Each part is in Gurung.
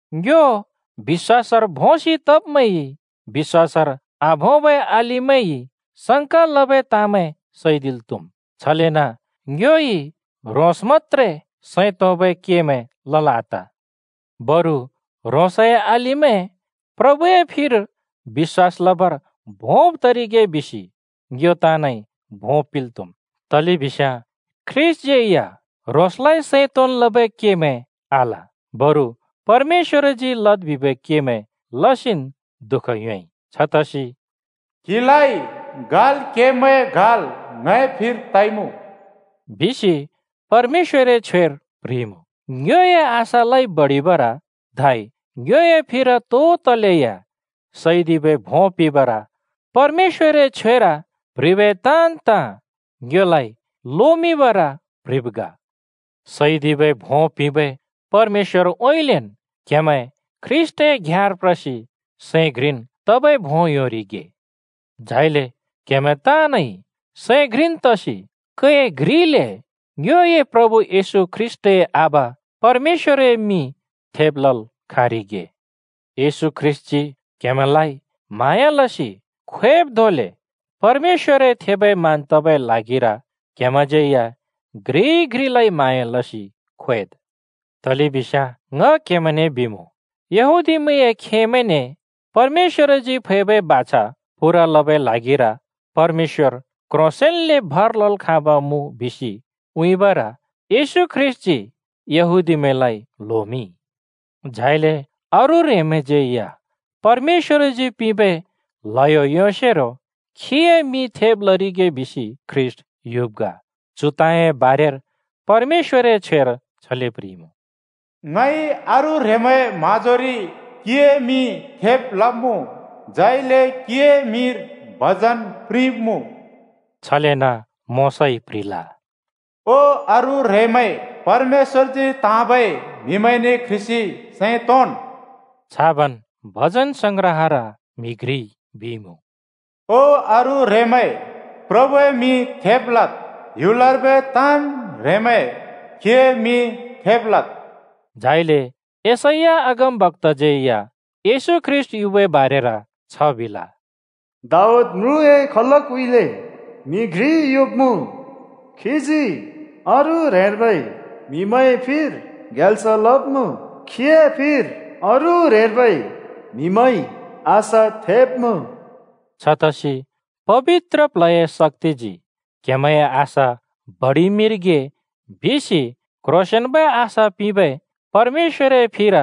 ङ्यो बिश्‍वासर भोंसि तब्‍मैंइ बिश्‍वासर आभोंबै अलिमैंइ संका लबै ताँमैं सैदिल् त्‍हुम्। छलेन ङ्योइ ह्रोंस मत्‍त्रे सैं तोंबै केमैं लल् आत, बरु ह्रोंसए अलिमैं प्रभुए फिर बिश्‍वास लबर भोंब तरिगे बिसि ङ्यो ताँनइ भों पिंल् त्‍हुम्, तलेबिस्याँ ख्रीष्‍टज्‍यै या ह्रोंसए सैं तोंन् लबै केमैं आल, बरु परमेश्‍वरजी लद् बिबै केमैं लसिन् दुःख योंइ। छतसि “क्हिलाइ गाल् केब्‍मैंए गाल् ङए फिर तइमुँ,” बिसि परमेश्‍वरए छ्वेर प्ह्रिइमुँ: ङ्योए आशालाइ बडिबर धै ङ्योए फिर तो तलेया सैदिबै भों पिंबर परमेश्‍वरए छ्वेर प्‍ह्रिबै ताँन् ताँ ङ्योलाइ लोमिंबर प्‍ह्रिब् ग। सैदिबै भों पिंबै परमेश्‍वरउँइँलेन् क्‍हेमैं ख्रीष्‍टए घ्याँर प्रसि सैं घ्रिन् तबै भों योंरिगे। झाइले क्‍हेमैं ताँनइ सैं घ्रिन् तसि कै घ्रिले, ङ्योए प्रभु येशू ख्रीष्‍टए आबा परमेश्‍वरए मिं थेब् लल् खाँरिगे। येशू ख्रीष्‍टजी क्‍हेमैंलाइ म्हाँया लसि ख्वेब् धोंले परमेश्‍वरए थेबै मान तबै ल्हागिर क्‍हेमैंज्‍यै या घ्रिइ घ्रिलाइ म्हाँया लसि ख्वेद्। तलेबिस्याँ ङ क्हेमैंने बिमुँ, यहूदीमैंए खेमैंने परमेश्‍वरजी फैबै बाछा पूरा लबै ल्हागिर परमेश्‍वर क्ह्रोंसेंन्ले भर लल् खाँब मुँ बिसि उँइँबर येशू ख्रीष्‍टजी यहूदीमैंलाइ ल्होमिंइ। झाइले अरू ह्रेंमैंज्‍यै या परमेश्‍वरजी पिंबै ल्हयो योंसेरो खीए मिं थेब् लरिगे बिसि ख्रीष्‍ट युब् ग। चु ताँए बारेर परमेश्‍वरए छ्वेर छले प्ह्रिइमुँ, “ङइ अरू ह्रेंमैंए म्‍हाँजोरि क्‍हिए मिं थेब् लब्‍मुँ, झाइले क्‍हिए मिंर भजन प्रिंब्‍मुँ।” छलेन मोशाइ प्‍ह्रिल, “ओ अरू ह्रेंमैं, परमेश्‍वरजी त्‍हाँबै म्‍हिमैंने क्ह्रिसि सैं तोंन्।” छाबन् भजनसंग्रहर म्‍हि घ्रिइ बिइमुँ, “ओ अरू ह्रेंमैं, प्रभुए मिं थेब् लद्। ह्‍युलर्बै ताँन् ह्रेंमैं, खीए मिं थेब् लद्।” झाइले यशैया अगमबक्‍ताज्‍यै या येशू ख्रीष्‍ट युबै बारेर छ बिल, “दाऊद म्रुँए खलकउँइँले म्‍हि घ्रि युब्‍मुँ, खीजी अरू ह्रेंर्बै म्‍हिमैंए फिर ग्याल्स लब्‍मुँ, खीए फिर अरू ह्रेंर्बै म्‍हिमैंइ आशा थेंब्‍मुँ।” छतसि पबित्र प्ल्हए शक्‍तिजी क्‍हेमैंए आशा बडिमिंरिगे बिसि क्ह्रोंसेंन्बै आशा पिंबै परमेश्‍वरए फिर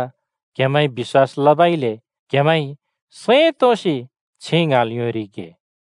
क्हेमैंइ बिश्‍वास लबइले क्‍हेमैंइ सैं तोंसि छिं ङ्हाँल् योंरिगे।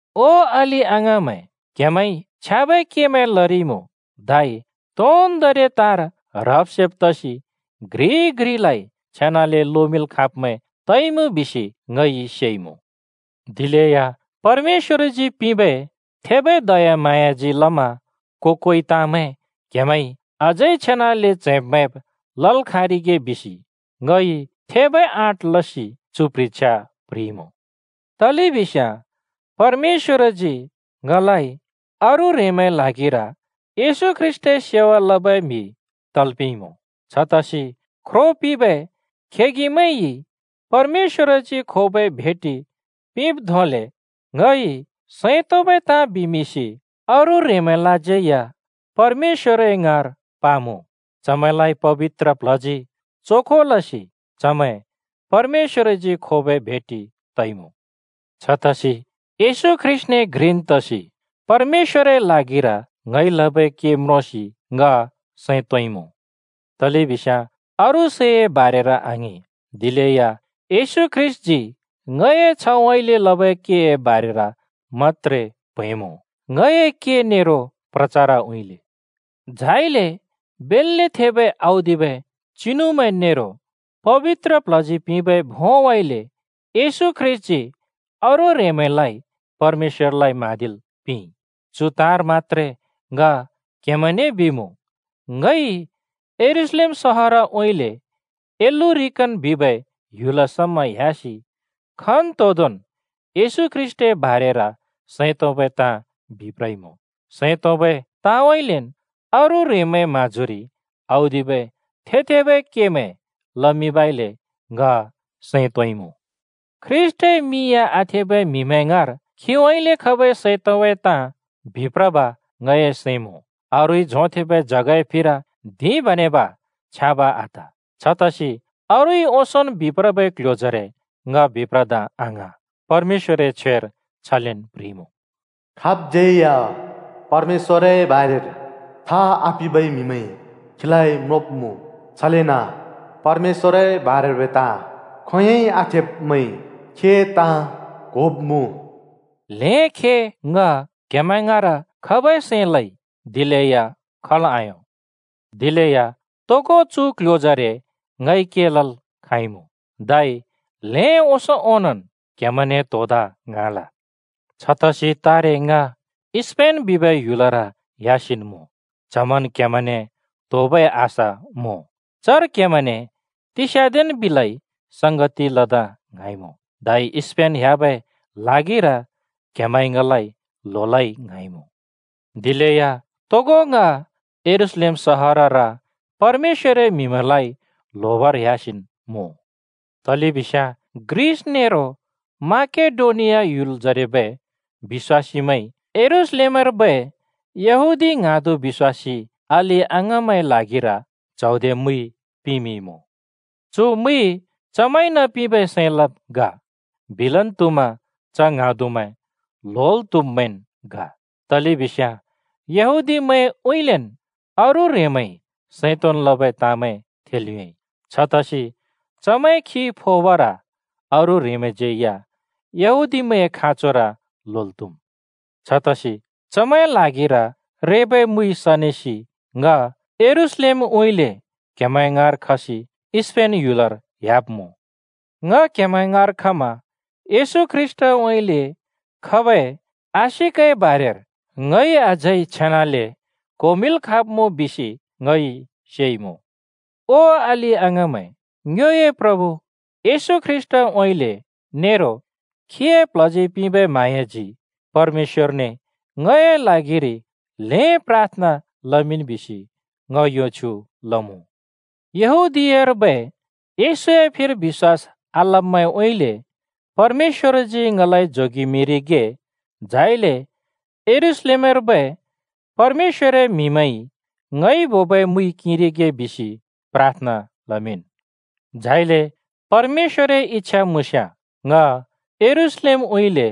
ओ ङए अलि-अङाँमैं, क्‍हेमैंइ छ्याँबै केमैं लरिइमुँ, धै तोन्दोंरि ताँर ह्रब् सेब् तसि घ्रिइ घ्रिलाइ छेनाले लोमिंल् खाँब्मैं तइमुँ बिसि ङइ सेइमुँ। दिलेया परमेश्‍वरजी पिंबै थेबै दयाम्हाँयाजी लमा को-कोइ ताँमैं क्‍हेमैंइ अझै छेनाले च्हैंब् मैंब् लल् खाँरिगे बिसि ङइ थेबै आँट लसि चु प्ह्रिछ्या प्ह्रिइमुँ। तलेबिस्याँ परमेश्‍वरजी ङलाइ अरू ह्रेंमैंए ल्हागिर येशू ख्रीष्‍टए सेवा लबै म्‍हि तल् पिंइमुँ। छतसि ख्रो पिंबै खेगिमैंइ परमेश्‍वरजी खोबै भेटि पिंब् धोंले ङइ सैं तोंबै ताँ बिमिंसि अरू ह्रेंमैंलाज्यै परमेश्‍वर ङाँर पमुँ। चमैंलाइ पबित्र प्ल्हजी चोखो लसि चमैं परमेश्‍वरजी खोबै भेटि तइमुँ। छतसि येशू ख्रीष्‍टने घ्रिन् तसि परमेश्‍वरए ल्हागिर ङइ लबै के म्रोंसि ङ सैं तोंइमुँ। तलेबिस्याँ अरू सैए बारेर आङिं, दिलेया येशू ख्रीष्‍टजी ङए छ्हउँइँले लबै केए बारेर मत्‍त्रे प्‍हैंमुँ। ङए के नेरो प्रचारउँइँले, झाइले बेल्‍ले थेबै औदिबै चिनुमैं नेरो पबित्र प्ल्हजी पिंबै भोंउँइँले येशू ख्रीष्‍टजी अरू ह्रेंमैंलाइ परमेश्‍वरलाइ म्हाँदिल् पिंइ। चु ताँर मत्‍त्रे ङ क्‍हेमैंने बिमुँ। ङइ यरूशलेम सहरउँइँले इल्‍लुरिकन बिबै ह्‍युल समा ह्‍यासि खन्तोंदोंन् येशू ख्रीष्‍टए बारेर सैं तोंबै ताँ बिप्रइमुँ। सैं तोंबै ताँउँइँलेन् अरू ह्रेंमैंए म्हाँजोरि औदिबै (थेब्-थेबै) केमैं लमिंबइले ङ सैं तोंइमुँ। ख्रीष्‍टए मिं या आथेबै म्हिमैं ङाँर खीउँइँले खबै सैं तोंबै ताँ बिप्रब ङए सैं मुँ। अरूइ झोंथेंबै जगए फिर धिं बेनब छ्याँब आत। छतसि अरूइ ओंसोंन् बिप्रबै क्‍ल्‍ह्‍यो जरे ङ बिप्रदा आङ्हाँ। परमेश्‍वरए छ्वेर छलेन् प्ह्रिइमुँ, “खाबज्‍यै या परमेश्‍वरए बारेर था आपिंबै म्हिमैंइ खीलाइ म्रोंब्‍मुँ, छलेन परमेश्‍वरए बारेर्बै ताँ खोंयोंइ आथेब्‍मैंइ खीए ताँ क्‍होब्‍मुँ।” ल्हें खे ङ क्‍हेमैं ङाँर खबै सैं लइ, दिलेया खल् आयों। दिलेया तोगो चु क्‍ल्‍ह्‍योजरे ङइ के लल् खाँइमुँ, धै ल्हें ओंसों ओनोंन् क्‍हेमैंने त्‍होदा ङ्हाँल। छतसि तारे ङ स्‍पेन बिबै ह्‍युलर ह्‍यासिन्मुँ, च्हमन् क्‍हेमैंने त्‍होबै आशा मुँ। चर क्हेमैंने तिस्‍याँदेन् बिलै संगति लदा ङ्हाँइमुँ। धै स्‍पेन ह्‍याबै ल्हागिर क्‍हेमैंइ ङलाइ ल्होलै ङ्हाँइमुँ। दिलेया तोगो ङ यरूशलेम सहरर परमेश्‍वरए म्‍हिमैंलाइ ल्होबर ह्‍यासिन् मुँ। तलेबिस्याँ ग्रिस नेरो म्‍याकेडोनिया ह्‍युलजरेबै बिश्‍वासीमैंइ यरूशलेमर्बै यहूदी ङ्हाँदु बिश्‍वासी अलि-अङाँमैंए ल्हागिर च्हौदे मुइ पिमिंइमुँ। चु मुइ चमैंइन पिंबै सैं लब् ग। बिलन त्हुमा च ङ्हाँदुमैं ल्होल् त्‍हुब्मैंन् ग, तलेबिस्याँ यहूदीमैंउँइँलेन् अरू ह्रेंमैंइ सैं तोंन् लबै ताँमैं थेल् योंइ, छतसि चमैंए खि फोबर अरू ह्रेंमैंज्‍यै या यहूदीमैंए खाँचोर ल्होल् त्‍हुम्। छतसि चमैंए ल्हागिर रेबै मुइ सनेसि ङ यरूशलेमउँइँले क्हेमैं ङाँर खसि स्‍पेन ह्‍युलर ह्‍याब्‍मुँ। ङ क्‍हेमैं ङाँर खमा येशू ख्रीष्‍टउँइँले खबै आशिकए बारेर ङइ अझै छेनाले क्होमिंल् खाँब्मुँ बिसि ङइ सेइमुँ। ओ अलि-अङाँमैं, ङ्योए प्रभु येशू ख्रीष्‍टउँइँले नेरो खीए प्ल्हजी पिंबै म्हाँयाजी परमेश्‍वरने ङए ल्हागिरि ल्हें प्राथना लमिंन् बिसि ङ यो छ्युँ लमुँ। यहूदीयार्बै येशूए फिर बिश्‍वास आलब्‍मैंउँइँले परमेश्‍वरजी ङलाइ जोगेमिंरिगे, झाइले यरूशलेमर्बै परमेश्‍वरए म्‍हिमैंइ ङइ बोबै मुइ किंरिगे बिसि प्राथना लमिंन्। झाइले परमेश्‍वरए इच्छा मुँस्याँ ङ यरूशलेमउँइँले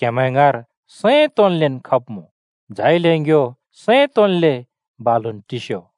क्‍हेमैं ङाँर सैं तोंन्लेन् खब्मुँ, झाइले ङ्यो सैं तोंन्ले बालुन् टिस्यो।